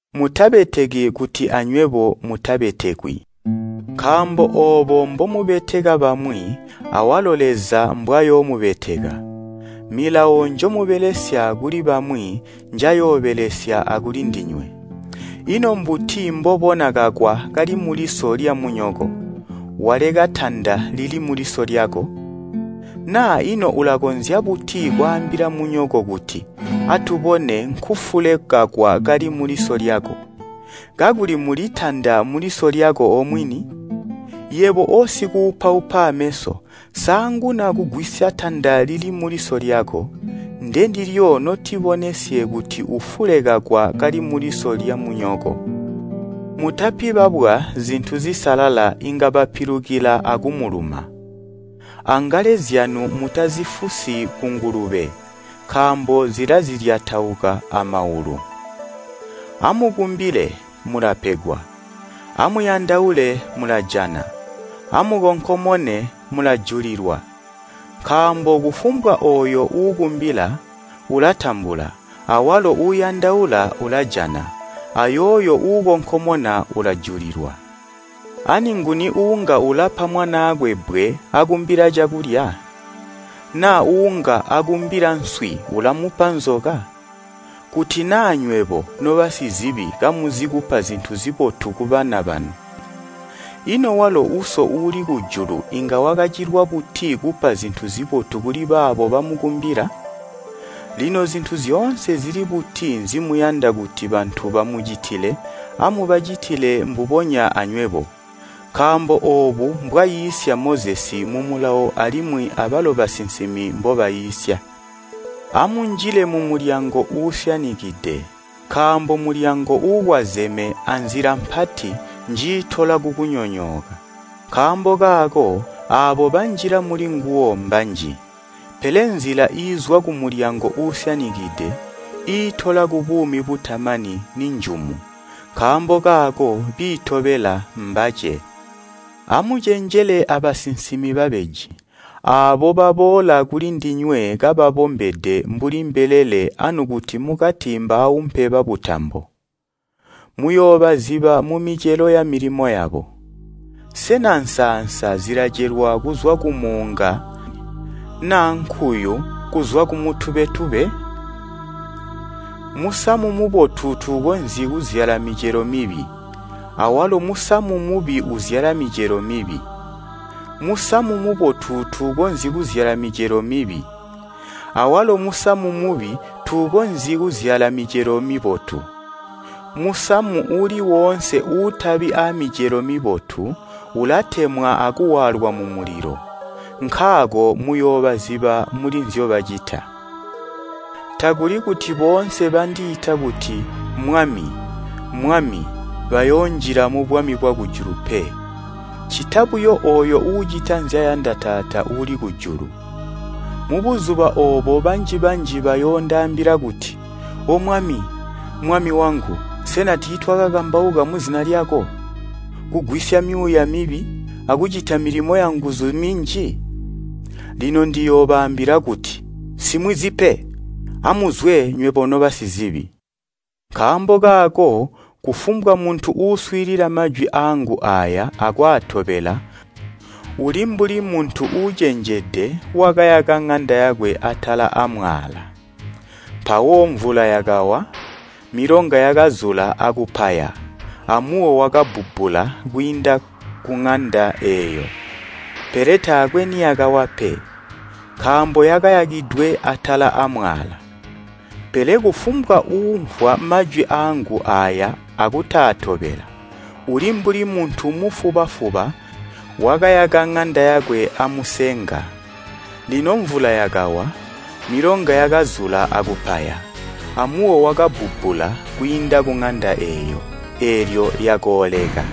“Mutabeteki kuti anywebo mutabetekwi. Nkaambo oobo mbomubeteka bamwi awalo Leza mbwayoomubeteka, milawo njomubelesya kuli bamwi njayoobelesya akulindinywe. Ino mbuti mbobona kakwa kali muliso lyamunyoko, waleka tanda lili muliso lyako? Naa ino ulakonzya buti kwaambila munyoko kuti, ‘Atubone nkufule kakwa kali muliso lyako!’ Kakuli muli tanda muliso lyako omwini? Yebo osikuupaupa ameso saanguna kugwisya tanda lili muliso lyako, ndendilyo notibonesye kuti ufule kakwa kali muliso lyamunyoko. “Mutapi babwa zintu zisalala inga bapilukila akumuluma. Angale zyanu mutazifusi kungulube, nkaambo zilazilyatauka amaulu. “Amukumbile, mulapegwa, amuyandaule mulajana, amukonkomone mulajulilwa. Nkaambo kufumbwa ooyo uukumbila ulatambula, awalo uuyandaula ulajana, ayooyo uukonkomona ulajulilwa. Ani nguni uunga ulapa mwanaakwe bbwe akumbila cakulya? Na uunga akumbila nswi ulamupa nzoka? Kuti naa nywebo, nobasizibi kamuzi kupa zintu zibotu kubana banu, ino walo Uso uuli kujulu inga wakacilwa buti kupa zintu kuli baabo bamukumbila? “Lino zintu zyoonse zili buti nzimuyanda kuti bantu bamucitile amubacitile mbubonya anywebo. Nkaambo oobu mbwaiisya Mozesi mumulawo alimwi abalo basinsimi mbobaiisya. “Amunjile mumulyango uusyanikide nkaambo mulyango uukwazeme anzila mpati njiitola kukunyonyooka, nkaambo kaako aabo banjila mulinguwo mbanji. Pele nzila iizwa kumulyango uusyanikide, iitola kubuumi butamani ninjumu. Nkaambo kaako biitobela mbace. “Amucenjele abasinsimi babeji. Aabo baboola kulindinywe kababombede mbuli mbelele anukuti mukati mbaaumpe babutambo. Muyoobaziba mumicelo yamilimo yabo. Sena nsaansa zilacelwa kuzwa kumuunga naa nkuyu kuzwa kumutubetube? Musamu mubotu tuukonzyi kuzyala micelo mibi, awalo musamu mubi uzyala micelo mibi. Musamu mubotu tuukonzyi kuzyala micelo mibi, awalo musamu mubi tuukonzyi kuzyala micelo mibotu. Musamu uuli woonse uutabi aamicelo mibotu ulatemwa akuwaalwa mumulilo. Nkaako muyoobaziba muli nzyobacita. “Takuli kuti boonse bandiita kuti ‘Mwami, Mwami’ bayoonjila mubwami bwakujulu pe, ccita buyo ooyo uucita nzyayanda Taata uuli kujulu. Mubuzuba oobo banji-banji bayoondaambila kuti ‘O Mwami, Mami wangu, sena tiitwaakakambauka muzina lyako, kugwisya myuuya mibi, akucita milimo yanguzu minji?’ Lino ndiyoobaambila kuti, ‘Nsimwizi pe! Amuzwe nywebo nobasizibi.’ “Nkaambo kaako kufumbwa muntu uuswiilila majwi aangu aaya akwaatobela uli mbuli muntu uucenjede wakayaka ŋanda yakwe atala aamwaala. Mpawo mvula yakawa, milonga yakazula akupaya amuwo wakabbubbula kwiinda kuŋanda eeyo, pele taakwe niyakawa pe, nkaambo yakayakidwe atala aamwaala. “Pele kufumbwa uumvwa majwi aangu aaya akutaatobela, uli mbuli muntu mufuba-fuba wakayaka ŋanda yakwe amusenga. Lino mvula yakawa, milonga yakazula akupaya, amuwo wakabbubbula kwiinda kuŋanda eeyo, eelyo yakooleka.”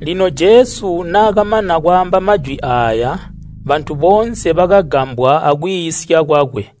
Lino Jesu naakamana kwaamba majwi aaya, bantu boonse bakagambwa akwiisya kwakwe.